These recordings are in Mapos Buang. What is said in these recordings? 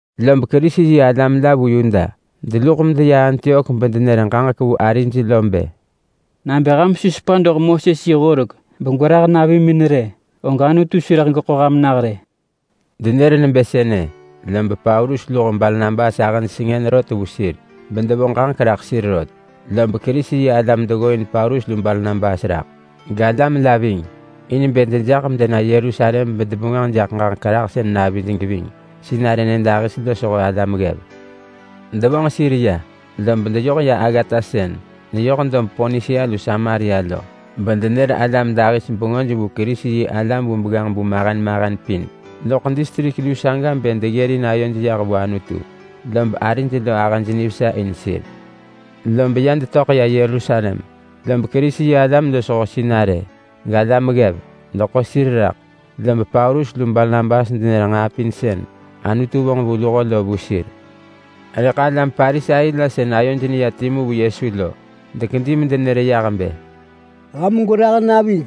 Lob Kerisi-yi-alam la vu Yuda deluḳ medeya Antiok bedenër ġaġek vu arij lo bë, “Nabë ham su sepa doḳ Moses yi horek begwerah navimin rë, og Anutu su rëḳ geḳo ham nah rë!” Denër nebë sënë, lob Paulus lu Barnabas ahëj sengën rot vu sir bedevo ġaġek raḳ sir rot. Lob Kerisi-yi-alam deggooin Paulus lu Barnabas raḳ, galam la ving, in bë dejaḳ medena Yerusalem bedebengwënġ jaḳ ġaġek rahsën navij geving sinarë nyëdahis losho alam ggev. Devonġ sir ya, lob ya deyoh aggata sën neyoh ya dob Ponisia lu Samaria lo, bedenër bengö vu Kerisi-yi-alam vu begganġ-bu mahen mahen pin loḳ distrik luu saga bë alam dahis deggërin ayoj yah vu Anutu. Lob arij lo ahëj nivesa in. Lob ya detöḳ ya Yerusalem, lob Kerisi-yi-alam losho sinarë, galam ggev, deḳo sir raḳ. Lob Paulus lu Barnabas denër nġaa pin sën Anutu vonġ vu luho lo vu sir. Rëḳ alam Parisai la sën ayoj neya timu vu Yesu lo dekedi medenër yah bë, “Ham gwerah navij,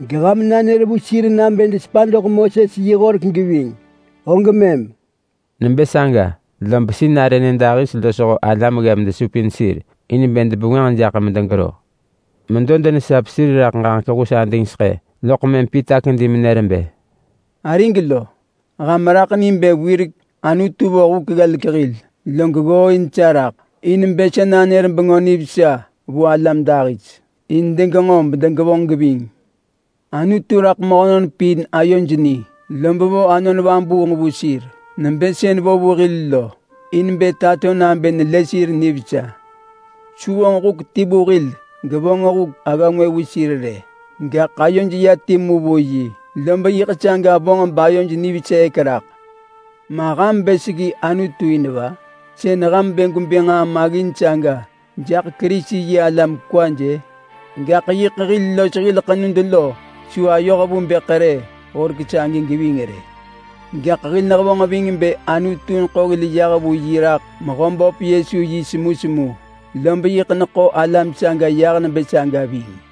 geham nanër vu sir nabë desepa doḳ Moses yi Horek geving, og mëm!” Nebë saga lob sinarë nyëdahis losho alam ggev desupin sir in bë debengwënġ jaḳ medegero. Medo denesap sir raḳ ġaġek hus adingseḳë, loḳ mëm Pita kedi menër bë, “Arig lo! Ham raḳ ni bë wirek Anutu vo huk ggelek hil, log ggooin sa raḳ in bë sa nanër Bengö Nivesa vu alam dahis in degenġo bedegevonġ geving. Anutu raḳ mehönon pin ayoj ni, lob vo Anon Vabuung vu sir, nebë sën vo vu hil lo, in bë tato nabë nelë sir nivesa. Su vonġ huk ti vu hil gevonġ huk agga ngwë vu sir rë. Gaḳ ayoj ya timu vu yi lob yiḳ saga vonġ bayoj niveseek raḳ. Ma ham bë seggi Anutu in va? Sën ham bë gwebë nġaa maggin saga jaḳ Kerisi-yi-alam kwaj-ë! Gaḳ yiḳ hil los hil ḳenud lo su ayoh vu bë ḳerë horek sagi geving rë. Gaḳ hil nehevonġ ving bë Anutu neḳo hil yah vu yi raḳ Mehöböp Yesu yi semusemu, lob yiḳ neḳo alam saga yah nebë saga ving.”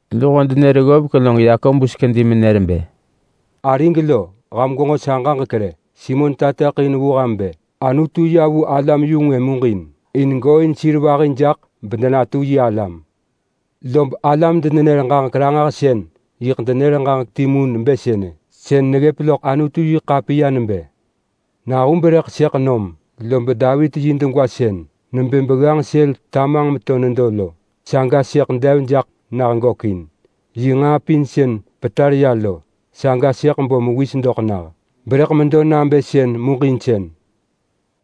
Luho denër ggovek log Yakobus kedi menër bë, “Arig lo, ham gwenġo sa ġaġek rë! Simon nër vu ham bë Anutu yam vu alam-yu-ngwë muġinsën nebë sënë in gooin sir vahi jaḳ bedenatu yi alam. Lob alam-denenër-ġaġek-ranġahsën yiḳ denër ġaġek timu nebë sënë. Sën neggëp loḳ Anutu-yi-ḳapiya nebë: ‘Nahub rëḳ sëḳ nam, lob Davit yi dub sën tamanġ meto nedo lo, saga sëḳ dev jaḳ nah gökin. Yi nġaa pin sën petar ya lo, saga sëḳ bo mewis doḳ nah, berëḳ medo nabë sën muġinsën.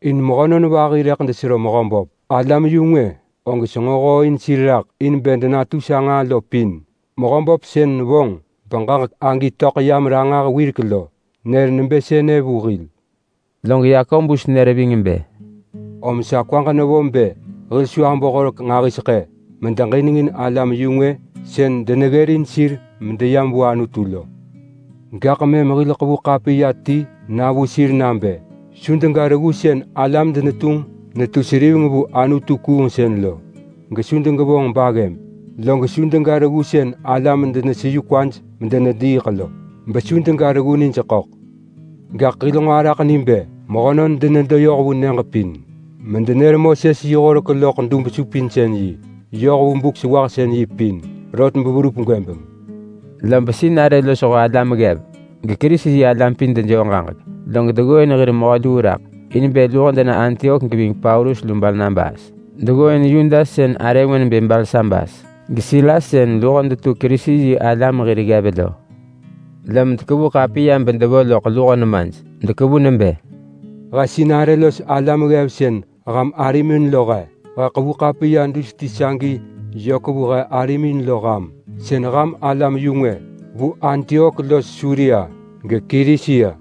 In mehönon vahi rëḳ desero Mehöböp. Alam-yu-ngwë sën senġo hooin sir raḳ in bë denatu sa nġaa lo pin. Mehöböp sën vonġ beġaġek agi töḳ yam ranġah wirek lo, lob nër nebë sënë vu hil.’” Log nër ving bë, “Om sa kwaġ nevo bë hil su abo horek nġahiseḳë medeġinengin alam-yu-ngwë sën deneggërin sir medeyam vu Anutu lo. Gaḳ mëm hil ḳevu ḳapiya ti na vu sir nabë su dega reggu sën alam denetunġ netu seriveng vu anutu-kuungsën lo, gesu degevonġ baggëb, log su dega reggu sën alam deneseyu kwaj medenediiḳ lo, besu dega reggu nij ḳöḳ. Gaḳ hil nġo araḳ ni bë mehönon denedo yoh vu nyëġ pin medenër Moses yi horek loḳ dub-supinsën-yi yoh vu Buk-sewahsën-yi pin rot beverup gwëbeng. Lob sinarë losho alam ggev geKerisi-yi-alam pin dejoo ġaġek, log deggooin hir mehö luu raḳ in bë luho dena Antiok geving Paulus lu Barnabas. Deggooin Yudas sën arë ngwë nebë Barsabas geSilas, sën luho detu Kerisi-yi-alam hir ggev lo. Lom dekevu ḳapiya bedevo loḳ luho nemaj. Dekevu nebë: He sinarë los alam ggev sën ham arimin lo he. He ḳevu ḳapiya dus ti sagi yök vu he arimin lo ham sën ham alam-yu-ngwë vu Antiok los Suria, geKilisia.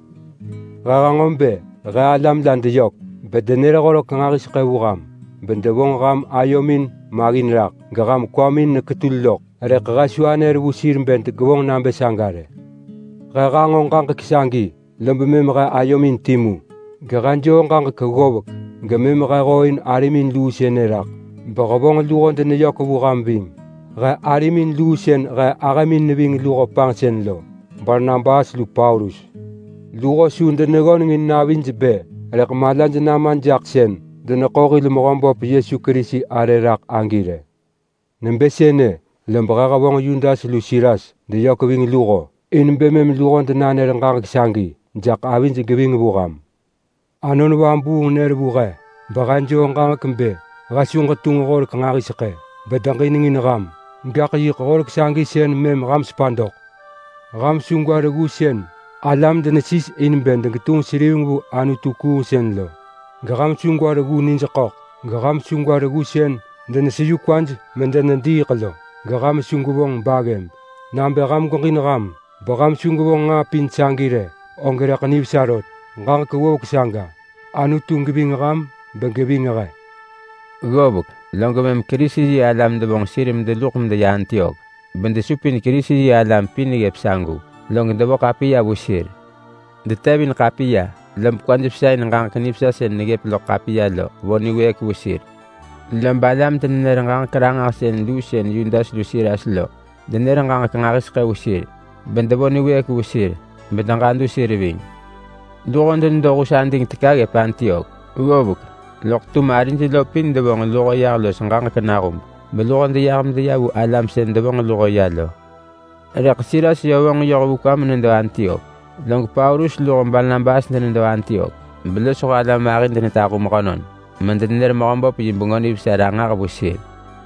He hanġo bë he alam la deyök bedenër horek nġahiseḳë vu ham bedevonġ ham ayomin maggin raḳ geham kwamin neketul loḳ. Rëḳ he su anër vu sir bë degevonġ nabë saga rë. He hanġo ġaġek sagi, lob mëm he ayomin timu, gehe joo ġaġek ggovek gemëm he hooin arimin luu sënë raḳ behevonġ luho deneyök vu ham ving he arimin luu sën he ahëmin ving luho panġsën lo, Barnabas lu Paulus. Luho su deneggöneng in navij bë rëḳ malaj nama jaḳ sën deneḳo hil Mehöböp Yesu Kerisi arë raḳ agi rë. Nebë sënë, lob he hevonġ Yudas lu Silas deyök ving luho in bë mëm luho denanër ġaġek sagi jaḳ avij geving vu ham. Anon Vabuung nër vu he, behe joo ġaġek bë he su ġetunġ horek nġahiseḳë bedeġinengin ham. Gaḳ yiḳ horek sagi sën mëm ham sepa doḳ. Ham su gwa reggu sën alam denesis in bë degetunġ seriveng vu anutu-kuungsën lo, geham su gwa reggu nij ḳöḳ, geham su gwa reggu sën deneseyu kwaj medenediiḳ lo, geham su gwevonġ baggëb. Nabë ham gweġin ham besu gwevonġ nġaa pin sagi rë, og rëḳ nivesa rot. Ġaġek ggovek saga. Anutu geving ham begeving he. Ggovek, log mëm Kerisi-yi-alam devonġ sir medeluḳ medeya Antiok, bedesupin Kerisi-yi-alam pin ggëp sagu, log devo ḳapiya vu sir. Detevin ḳapiya, lob kwaj vesa in ġaġek nivesa sën neggëp loḳ ḳapiya lo vo niwëëk vu sir. Lob alam-denenër-ġaġek-ranġahsën luu sën Yudas lu Silas lo, denër ġaġek nġahiseḳë vu sir, bedevo niwëëk vu sir bedeġadu sir ving. Luho denedo hus ading teka ggëp Antiok ggovek, loḳ tum arij lo pin devonġ luho yah los ġaġek nahub, beluho deyah medeya vu alam sën devonġ luho ya lo. [Rëḳ Silas yö vonġ yoh vu kwa menedo Antiok.] Log Paulus lu Barnabas denedo Antiok, belosho alam vahi denetahu mehönon medenenër Mehöböp yi Bengö Nivesa ranġah vu sir.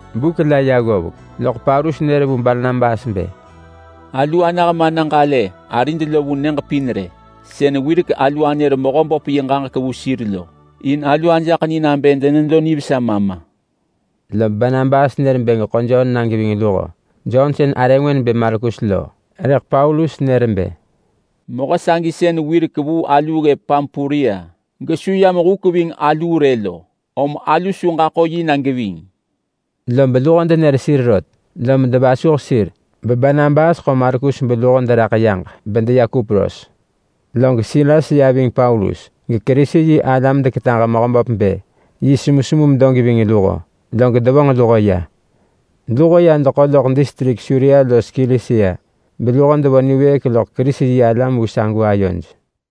Buk la ya ggovek loḳ Paulus nër vu Barnabas bë, “Alu anah mana ġalë arid lo vu nyëġ pin rë, sën wirek alu anër Mehöböp yi ġaġek vu sir lo. In alu ajaḳ ni nabë denedo nivesa ma ma!” Lob Barnabas bë geḳo Jon na geving luho. Jon sën arë ngwë nebë Markus lo. Rëḳ Paulus nër bë, “Mehö sagi sën wirek vuu aluu ggëp Pampulia gesu yam huk ving aluu rë lo, om alu su ġaḳo yi na geving!” Lob luho denër sir rot, lom devasuh sir beBarnabas ḳo Markus beluho deraḳ yaġ bedeya Kupros. Log Silas ya ving Paulus geKerisi-yi-alam deketaġ vu Mehöböp bë yi semusemu medo geving luho, log devonġ luho ya. Luho ya deḳo loḳ distrik Suria los Kilisia, beluho devo niwëëk loḳ Kerisi-yi-alam vu sagu ayoj.